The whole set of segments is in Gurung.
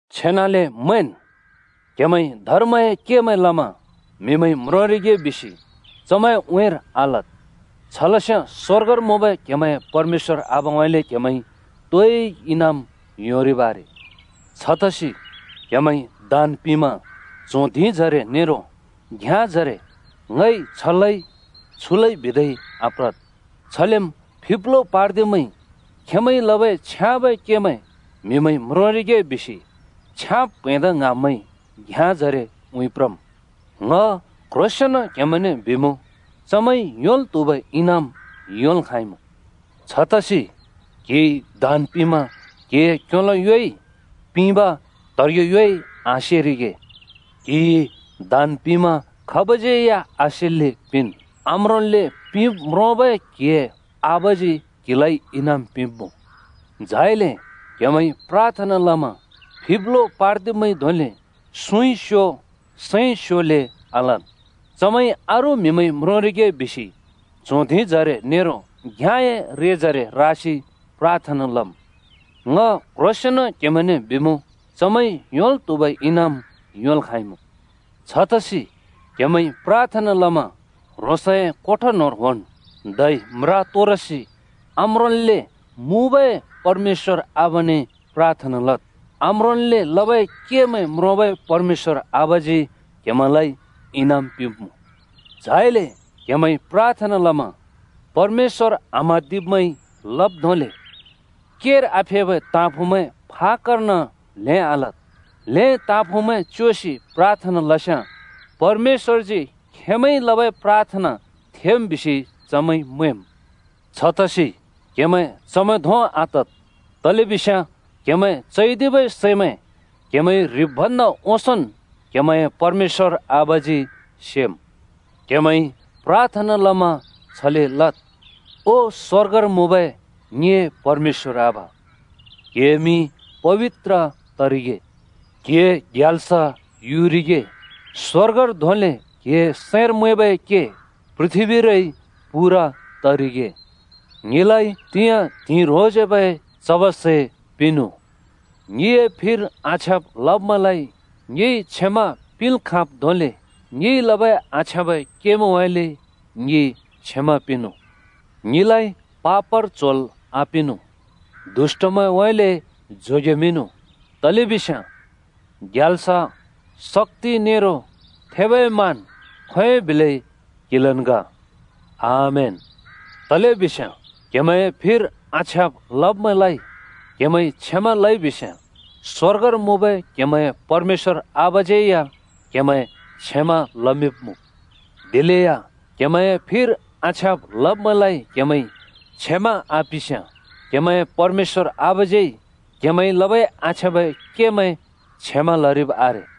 “छेनाले मैंन्, क्हेमैंइ धर्मए केमैं लमा म्‍हिमैंइ म्रोंरिगे बिसि चमैंए उँइँर आलद्। छ लस्याँ स्वर्गर मुँबै क्‍हेमैंए परमेश्‍वर आबाउँइँले क्हेमैंइ तोइ इनाम योंरिब् आरे। “छतसि क्‍हेमैंइ दान पिंमा च्हों धिंजरे नेरो घ्‍याँजरे ‘ङइ छ लइ छु लइ’ बिदै आप्रद्। छलेम् फिब्लो पार्दिब्मैंइ खेंमैंइ लबै छ्याँबै केमैं म्‍हिमैंइ म्रोंरिगे बिसि छ्याँब् प्हैंदा ङ्हाँब्मैंइ घ्याँजरे उँइँ प्रम्। ङ क्ह्रोंसेंन क्हेमैंने बिमुँ चमैंइ योंल् त्हुबै इनाम योंल् खाँइमुँ। छतसि क्‍हिइ दान पिंमा क्हिए क्योलो योइ पिंब त्हेब्रे योइ आसेरिगे। क्‍हिइ दान पिंमा खाबज्यै या आसेल्‍ले पिंन्। आम्रोंल्‍ले पिंब् म्रोंबै क्‍हिए आबाजी क्‍हिलाइ इनाम पिंब्‍मुँ। “झाइले क्हेमैंइ प्राथना लमा फिब्लो पार्दिब्मैंइ धोंले सुँइ स्यो सैंइ स्योले आलद्। चमैंइ अरू म्‍हिमैंइ म्रोंरिगे बिसि च्हों धिंजरे नेरो घ्याँए रेजरे रासि प्राथना लम्। ङ क्ह्रोंसेंन क्हेमैंने बिमुँ, चमैंइ योंल् त्हुबै इनाम योंल् खाँइमुँ। छतसि क्‍हेमैंइ प्राथना लमा ह्रोंसए कोठा न्‍होंर होंनु, धै म्रा तोरसि आम्रोंल्‍ले मुँबै परमेश्‍वर आबाने प्राथना लद्। आम्रोंल्‍ले लबै केमैं म्रोंबै परमेश्‍वर आबाजी क्‍हेमैंलाइ इनाम पिंब्‍मुँ। “झाइले क्‍हेमैंइ प्राथना लमा परमेश्‍वर आम्हाँदिब्मैंइ लब् धोंले केर आफेबै ताँफुँमैं फाक्‍कर्न ल्हेंन् आलद्। ल्हें ताँफुँमैं च्योसि प्राथना लस्‍याँ परमेश्‍वरजी खेंमैंइ लबै प्राथना थेम् बिसि चमैंइ मैंम्। छतसि क्‍हेमैं चमैं धों आतद्, तलेबिस्याँ क्‍हेमैं चैदिबै सैमैं क्हेमैंइ ह्रिब् भन्दा ओंसोंन् क्हेमैंए परमेश्‍वर आबाजी सेम्। क्‍हेमैंइ प्राथना लमा छले लद्: ओ स्‍वर्गर मुँबै ङिए परमेश्‍वर आबा, क्हिए मिं पबित्र तरिगे। क्हिए ग्याल्स युरिगे, स्‍वर्गर धोंले क्‍हिए सैंर मैंबै के पृथ्‍बीरै पूरा तरिगे। ङिलाइ तिंयाँ त्हिंइ ह्रोंसेबै चबै सै पिंनु। ङिए फिर आछ्याँब् लब्मैंलाइ ङिइ क्षमा पिंल् खाँब् धोंले ङिइ लबै आछ्याँबै केमैंउँइँले ङि क्षमा पिंनु। ङिलाइ पापर च्होल् आपिंनु, दुष्‍टउँइँले जोगेमिंनु। [तलेबिस्याँ ग्याल्स, शक्‍ति नेरो थेबै मान खोंयोंइ बिले क्हिलन् ग। आमेन।] “तलेबिस्याँ क्हेमैंए फिर आछ्याँब् लब्मैंलाइ क्हेमैंइ क्षमा लइ बिस्‍याँ स्वर्गर मुँबै क्हेमैंए परमेश्‍वर आबाज्‍यै या क्‍हेमैं क्षमा लमिंब्‍मुँ। दिलेया क्हेमैंए फिर आछ्याँब् लब्मैंलाइ क्हेमैंइ क्षमा आपिंस्‍याँ क्हेमैंए परमेश्‍वर आबाज्‍यै क्‍हेमैंइ लबै आछ्याँबै केमैं क्षमा लरिब् आरे।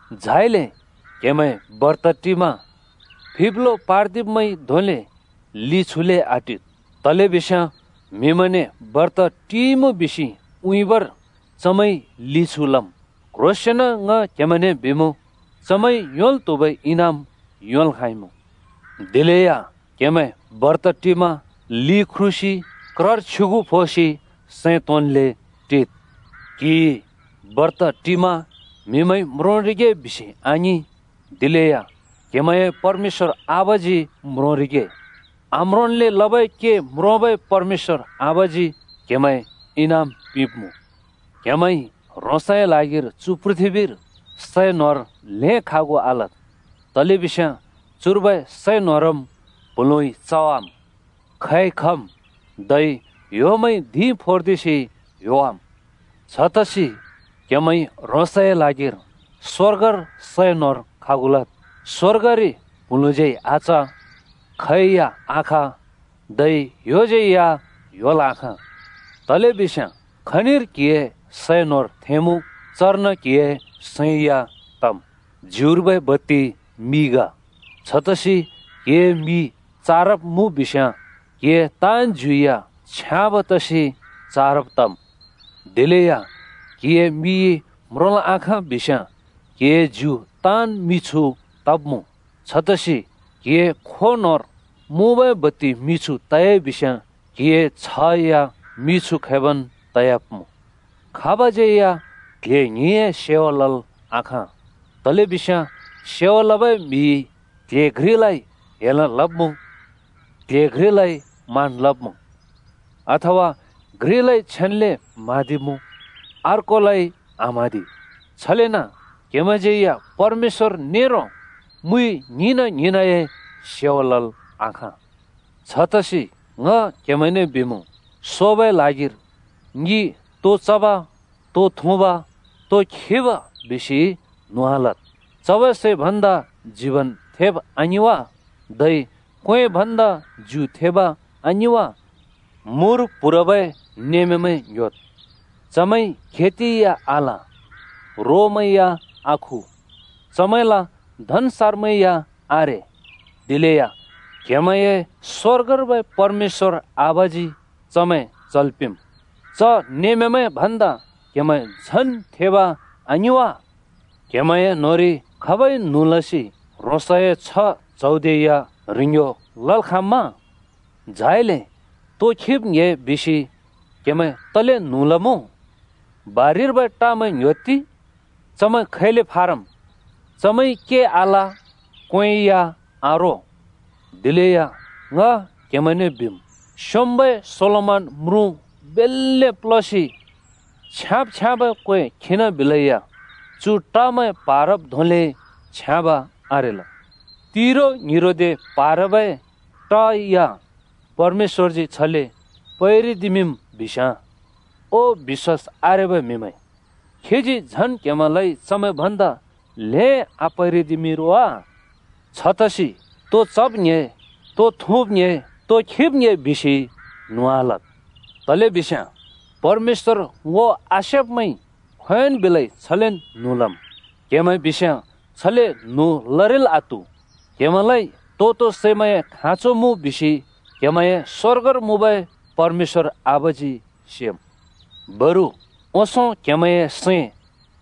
“झाइले क्‍हेमैं बर्त टिमा फिब्लो पार्दिब्मैंइ धोंले लि छुले आटिद्। तलेबिस्याँ म्हिमैंने ‘बर्त टिइमुँ’ बिसि उँइँबर चमैंइ लि छु लम्। क्ह्रोंसेंन ङ क्हेमैंने बिमुँ चमैंइ योंल् त्हुबै इनाम योंल् खाँइमुँ। दिलेया क्‍हेमैं बर्त टिमा लि ख्रुसि क्रर छ्युगु फोसि सैं तोंन्ले टिद्। ‘क्हिइ बर्त टिमा’ म्हिमैंइ म्रोंरिगे बिसि आङिं। दिलेया क्‍हेमैंए परमेश्‍वर आबाजी म्रोंरिगे। आम्रोंन्ले लबै के म्रोंबै परमेश्‍वर आबाजी क्हेमैं इनाम पिंब्‍मुँ। “क्‍हेमैंइ ह्रोंसए ल्हागिर चु पृथ्‍बीर सै न्होर ल्हें खागु आलद्, तलेबिस्याँ चुर्बै सै न्होरम् प्हुँलुँइ चवाम्, खै खम्, धै ह्‍योमैंइ धिं फोर्दिसि ह्‍योवाम्। छतसि क्‍हेमैंइ ह्रोंसए ल्हागिर स्‍वर्गर सै न्होर खागु लद्। स्‍वर्गरि प्‍हुँलुँज्यै आच, खै या आख धै ह्‍योज्‍यै या ह्‍योल् आखाँ। तलेबिस्याँ खनिर क्हिए सै न्होर थेंमुँ, चर्न क्हिए सैं या तम्। “ज्युर्बै बत्ति मि ग। छतसि क्‍हिए मि चारब मुँ बिस्याँ क्हिए ताँन् ज्यु या छ्याँब तसि चारब तम्। दिलेया क्‍हिए मिइ म्रोंल् आखाँ बिस्याँ क्‍हिए ज्यु ताँन् मिछु तब्‍मुँ। छतसि क्‍हिए खों न्होंर मुँबै बत्ति मिछु त‍याइ बिस्याँ क्‍हिए छ्ह या मिछु खैबन् तयाब्मुँ। “खाबज्यै या क्ल्हे ङ्हिंए सेवा लल् आखाँ। तलेबिस्याँ सेवा लबै म्हिइ क्ल्हे घ्रिलाइ हेल लब्मुँ, क्ल्हे घ्रिलाइ मान लब्मुँ, अथवा घ्रिलाइ छेन्‍ले म्हाँदिमुँ, अर्कोलाइ आम्हाँदि। छलेन क्‍हेमैंज्‍यै या परमेश्‍वर नेरो मुइ ङ्हिंना ङ्हिंनाए सेवा लल् आखाँ। “छतसि ङ क्‍हेमैंने बिमुँ, ‘सोबै ल्हागिर ङि तो चब, तो थुँब, तो खिब?’ बिसि न्हुँ आलद्। चबै सै भन्दा जीवन थेब आङिं वा? धै क्वें भन्दा ज्यु थेब आङिं वा? मुर प्‍हुरबै नेमामैं ङ्‌ह्‍योद्। चमैंइ खेति या आल, रोमैं या आखु, चमैंला धन्‍सारमैं या आरे। दिलया क्‍हेमैंए स्वर्गर्बै परमेश्‍वर आबाजी चमैं चल् पिंम्। च नेमामैं भन्दा क्‍हेमैं झन् थेब आङिं वा? क्‍हेमैंए न्होंरि खाबइ न्हुँ लसि ह्रोंसए छ्ह च्‍हौदे या ह्रिंग्यो लल् खाँम्‍मा? “झाइले तो खिब् ङ्‍हे बिसि क्‍हेमैं तले न्हुँ लमुँ? बारिर्बै टमैं ङ्‌ह्‍योत्ति! चमैं खैले फारम्। चमैंइ के आल, क्‍वें या आरो। दिलेया ङ क्हेमैंने बिमुँ, स्‍योंम्‍बै सोलोमन म्रुँ बेल्‍ले प्‍ल्‍होसि छ्याँब् छ्याँबै क्‍वें खिनाबिलेया चु टमैं प्‍हारब् धोंले छ्याँब आरेल। तिरो ङ्हिरोदे प्‍हारबै ट या परमेश्‍वरजी छले पैरिदिमिंम् बिस्याँ ओ बिश्‍वास आरेबै म्हिमैं, खीजी झन् क्‍हेमैंलाइ चमैं भन्दा ल्हें आपैरिदिमिं रो वा? छतसि तो चब? तो थुँब? तो खिब? बिसि न्हुँ आलद्। तलेबिस्याँ परमेश्‍वर ङो आसेब्‍मैंइ खोंयोंन् बिलै छलेन् न्हुँ लम्, क्‍हेमैं बिस्याँ छले न्हुँ लरिल् आत्हु। क्‍हेमैंलाइ तो-तो सैमैंए खाँचो मुँ बिसि क्‍हेमैंए स्वर्गर मुँबै परमेश्‍वर आबाजी सेम्। बरु ओंसों क्हेमैंए सैं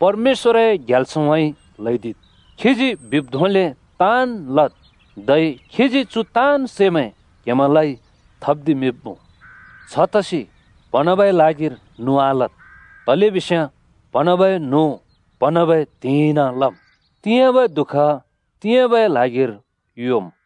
परमेश्‍वरए ग्याल्सउँइँ ल्‍हैदिद्, खीजी बिब् धोंले ताँन् लद्। धै खीजी चु ताँन् सैमैं क्हेमैंलाइ थप्दिमिंब्मुँ। छतसि प्हँन्हाँबै ल्हागिर न्हुँ आलद्, तलेबिस्याँ प्हँन्हाँबै न्हुँ प्हँन्हाँबै त्हिंइन लम्। तिंयाँबै दुःख तिंयाँबै ल्हागिर योम्।”